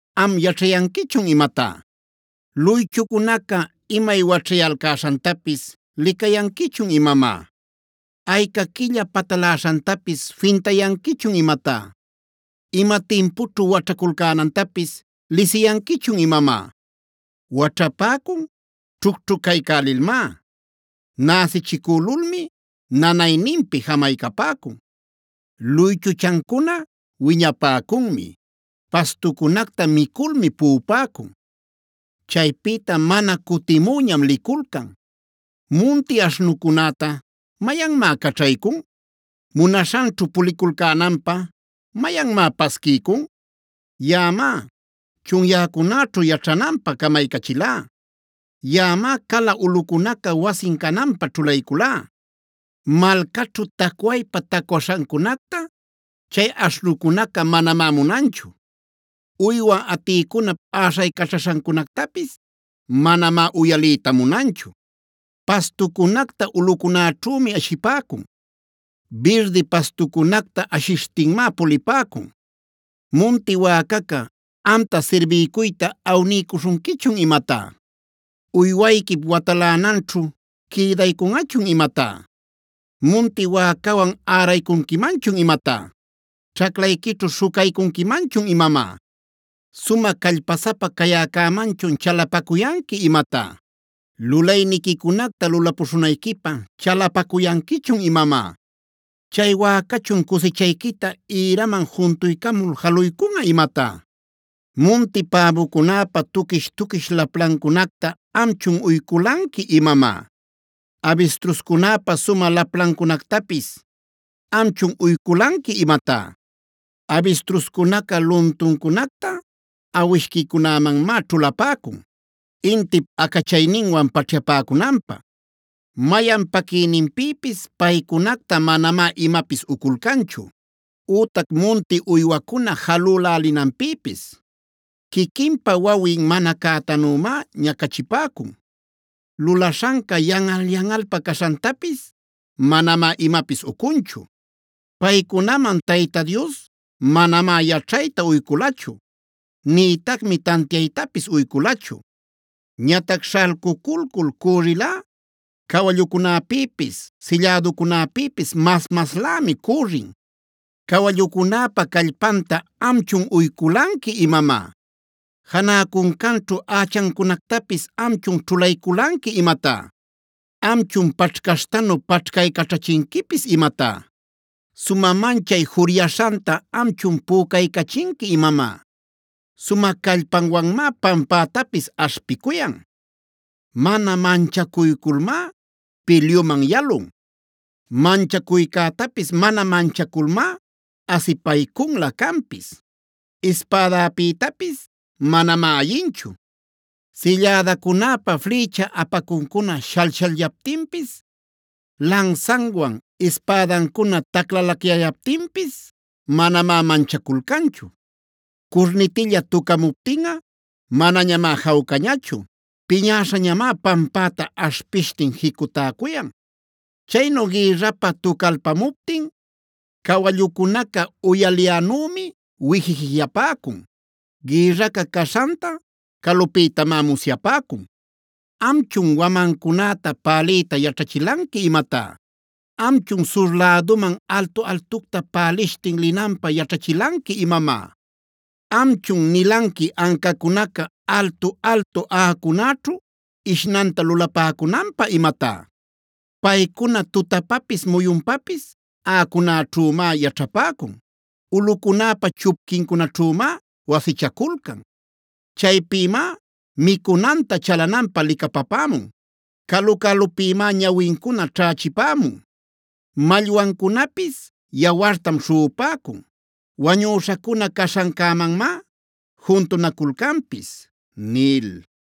am yaćhayanquichun imatá? ¿Luychucunaca imay waćhayalcäśhantapis licayanquichun imamá? ¿Ayca quilla pataläśhantapis fintayanquichun imatá? ¿Ima timpućhu waćhaculcänantapis lisiyanquichun imamá? Waćhapäcun ćhucćhucaycälilmá; näsichicülulmi nanayninpi jamaycapäcun. Luychuchancuna wiñapäcunmi; pastucunacta miculmi puꞌupäcun. Chaypïta mana cutimüñam liculcan. “¿Munti aśhnucunäta mayanmá caćhaycun? ¿Munaśhanćhu puliculcänanpä mayanmá pasquiycun? Yaꞌamá chunyäcunäćhu yaćhananpä camaycachilá; yaꞌamá cala ulꞌucunaca wasin cananpä ćhulayculá. Malcaćhu tacwaypa-tacwaśhancunacta chay aśhnucunaca manamá munanchu; uywa atïcunap äśhaycaśhancunactapis manamá uyaliyta munanchu. Pastucunacta ulꞌucunäćhümi ashipäcun; birdi pastucunacta ashishtinmá pulipäcun. “¿Munti wäcaca amta sirbiycuyta awniycuśhunquichun imatá? ¿Uywayquip watalänanćhu quïdaycunꞌachun imatá? ¿Munti wäcawan äraycunquimanchun imatá? ¿Ćhaclayquićhu śhucaycunquimanchun imamá? ¿Sumä callpasapa cayäcämanchun chalapacuyanqui imatá? ¿Lulayniquicunacta lulapuśhunayquipä chalapacuyanquichun imamá? ¿Chay wäcachun cusichayquita ïraman juntuycamul jaluycunꞌa imatá? “¿Munti päbucunäpa tuquish-tuquish laplancunacta amchun uyculanqui imamá? ¿Abistruscunäpa sumä laplancunactapis amchun uyculanqui imatá? Abistruscunaca luntuncunacta awishquicunämanmáa ćhulapäcun, intip acachayninwan paćhyapäcunanpä. Mayan paquïnanpïpis paycunacta manamá imapis uculcanchu, ütac munti uywacuna jalülälinanpïpis. Quiquinpa wawin mana cätanümá ñacachipäcun; lulaśhanca yanꞌal-yanꞌalpa caśhantapis manamá imapis ucunchu. Paycunaman Tayta Dios manamá yaćhayta uyculachu; nïtacmi tantiaytapis uyculachu. Ñatac śhalcuculcul cürrilꞌa cawallucunäpïpis sillädacunäpïpis mas-maslämi cürrin. “¿Cawallucunäpa callpanta amchun uyculanqui imamá? ¿Janä cuncanćhu ächancunactapis amchun ćhulayculanqui imatá? ¿Amchun paćhcaśhtanu paćhcaycaćhachinquipis imatá? ¿Sumä manchay juryaśhanta amchun pücaycachinqui imamá? Sumä callpanwanmá pampätapis aśhpicuyan; mana manchacuyculmá pilyuman yalun. Manchacuycätapis mana manchaculmá asipaycunlä canpis; ispädäpïtapis manamá ayinchu. Sillädacunäpa flïcha apacuncuna shall-shallyaptinpis, lansanwan, ispädancuna taclalacyayaptinpis manamá manchaculcanchu. Curnitilla tucämuptinꞌa manañamá jawcañachu; piñäśhañamá pampäta aśhpishtin jicutäcuyan. Chaynu gïrrapä tucalpamuptin cawallucunaca uyaliyänümi wijijijiapäcun; gïrraca caśhanta calupïtamá musyapäcun. “¿Amchun wamancunäta päliyta yaćhachilanqui imatá? ¿Amchun sur läduman altu-altucta pälishtin linanpä yaćhachilanqui imamá? ¿Amchun nilanqui ancacunaca altu-altu aꞌacunäćhu ishnanta lulapäcunanpä imatá? Paycuna tutapapis muyunpapis aꞌacunäćhümá yaćhapäcun; ulꞌucunäpa chupquincunaćhümá wasichaculcan. Chaypïmá micunanta chalananpä licapapämun; calu-calupïmá ñawincuna ćhächipämun. Mallwancunapis yawartam śhuꞌupäcun; wañüśhacuna caśhancämanmá juntunaculcanpis” nil.